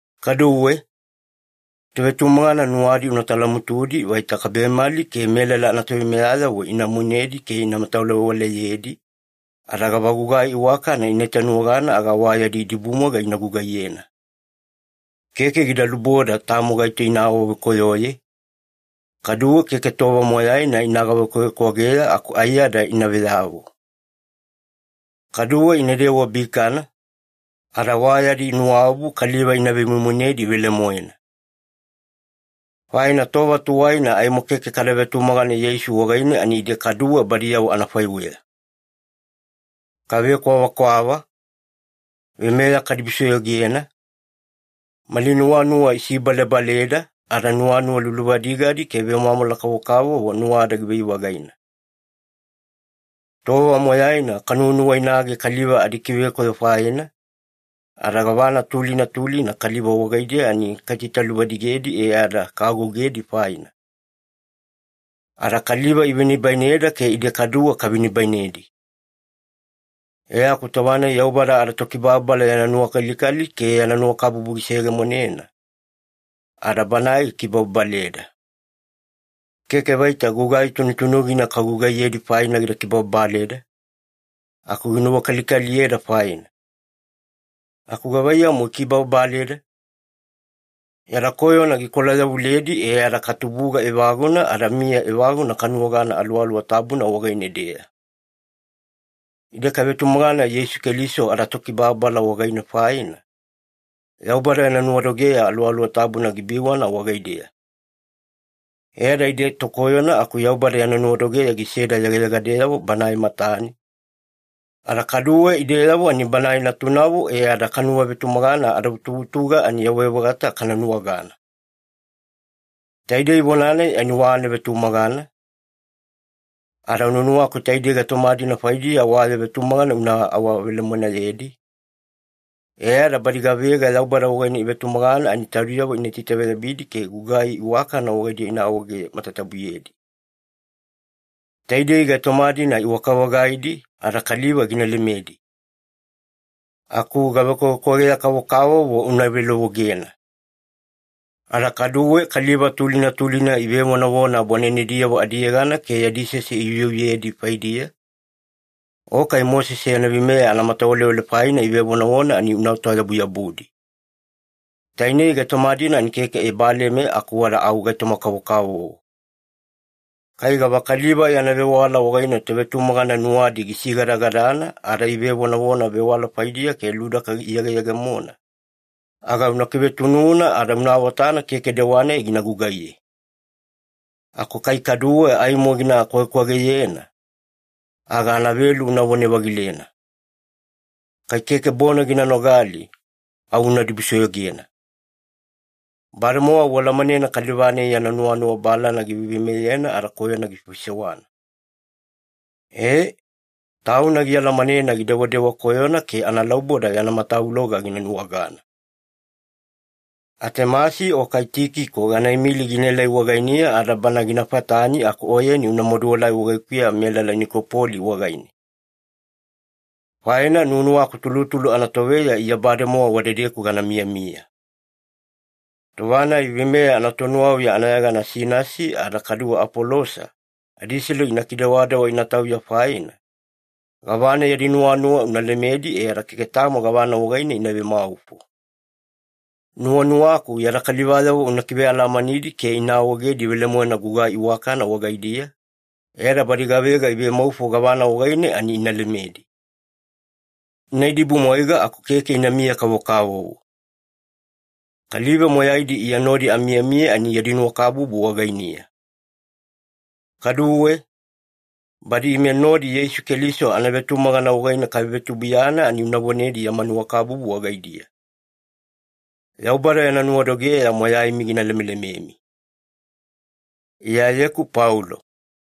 Kaduwe, tovetumagana nuwadi una talamutudi vaita kabemali ke melala anatoveimeyayavo ina moinedi ke ina matawalewaleyedi, ada gavagugai iwakana ina itanuwagana aga wa yadi idibumwaiga ina gugaiyena. Keke gida luboda tamo gaito ina awavekoyoye, kaduwe keke tova moyaina ina gavekwavekwageya aku aiyada ina veyavo. Kaduwe inadewa bikana, ada wa yadi nuwaobu kaliva ina vemoimoinedi velemoena. Faina tova tuwaina aimo keke kada vetumagana Yeisu wagaine, ani ide kaduwe badiyavo anafaiweya. Kavekwavakwava, veimeya kadibusoyogena, mali nuwanuwa isibalebaleda, ada nuwanuwa luluvadigadi ke vemwamwala kavokavovo nuwada givai-vagaina. Tova moyaina kanuwanuwainage kaliva adikivekoyo faina, ada gavana tulina tulina kaliva wagaidiya ani kaitaitaluvadigedi e ada kaagougedi faina. Ada kaliva ivenibaineda ke ide kaduwe kavenibainedi. E aku tova-nai Yaubada adaTokibababala yana nuwakalikali ke yana nuwakabubu giseyegemonena, ada Banae gikibababaleda. Keke vaita gugai tunutunugina kagugaiyedi faina gida kibababaleda, aku ginuwakalikaliyeda faina. Aku gavaiyamu gikibababaleda? Yada koyona gikolayavuledi e ada katubuga evaguna ada miya evaguna kanuwagana Aluwaluwa Tabuna wagaine-deya. Ide kavetumagana Yeisu Keliso adaTokibababala wagaine faina, Yaubada yana nuwadogeya Aluwaluwa Tabuna gibiwana wagaideya. E ada ide tokoyona aku Yaubada yana nuwadogeya giseda yegayegadeyavo Banae matane, ada kaduwe ideyavo ani Banae natunavo e ada kanuwavetumagana adavutuvutuga ani yawai-vagata kana nuwagana. Taidei vona-nai ani wa anavetumagana, ada nuwanuwaku taidei gaitoma-dina faidiya wa ya vetumagana una awavelemoenayedi, e ada badi gavega Yaubada wagaine ivetumagana ani taudiyavo ina itaveyabidi ke gugai iwakana wagaidiya ina awaege matatabuyedi. Taidei gaitoma-dina iwaka-vagaidi ada kaliva gina lemedi. Aku gavekwavekwageya-kavokavovo una velovogena. Ada kaduwe kaliva tulina tulina ivevonavona bwanenediyavo adiyegana ke yadi sese iuyeuyedi faidiya, o kai Mosese yana veimeya anamatawalewale faina ivevonavona, ani unaota-yabuyabudi. Tainei gaitoma-dina ani keke ebaleme aku wada au gaitoma-kavokavovo. Kai gavakaliva yana vewala wagaine tovetumagana nuwadi gisigadagadana ada ivevonavona vewala faidiya ke ludaka iyegeyegemona, aga una kivetununa ada una awatana keke dewa-nai gina gugaiye. Aku kai kaduwe aimo gina kwagekwageyena, aga anavelu unavone-vagilena. Kai keke bona gina nogali, au una dibusoyogena. Bademowa ualamanena kaliva-nai yana nuwanuwa balana giveiveimeyena ada koyona gifaifaisewana. Ee, tauna gialamanena gidewadewa koyona ke analauboda yana matavuloga gina nuwagana. Atemasi o kai Tikiko gana imili ginaelai wagainiya ada bana gina fatani aku oyeni una maduelai wagaikuya melala Nikopoli wagaine. Faina nuwanuwaku tulutulu anatoveya Iya bademowa wadedeku gana miyamiya. Tova-nai veimeya anatonuwauya anayegana Sinasi ada kaduwe Apolosa adiselu ina kidewadewa ina tauya faina, gavana yadi nuwanuwa una lemedi e ada keke tamo gavana wagaine ina vemaufo. Nuwanuwaku yada kalivayavo una kivealamanidi ke ina awaegedi velemoena gugai iwakana wagaidiya, e ada badi gavega ivemaufo gavana wagaine ani ina lemedi. Ina idibumwaiga aku keke inamiya-kavokavovo. Kaliva moyaidi Iya nodi amiyamiya ani yadi nuwakabubu wagainiya. Kaduwe, badi ime nodi Yeisu Keliso anavetumagana wagaine kavevetubuiyana ani una vonedi yama nuwakabubu wagaidiya. Yaubada yana nuwadogeya moyaimi gina lemelememi. Iyayeku Paulo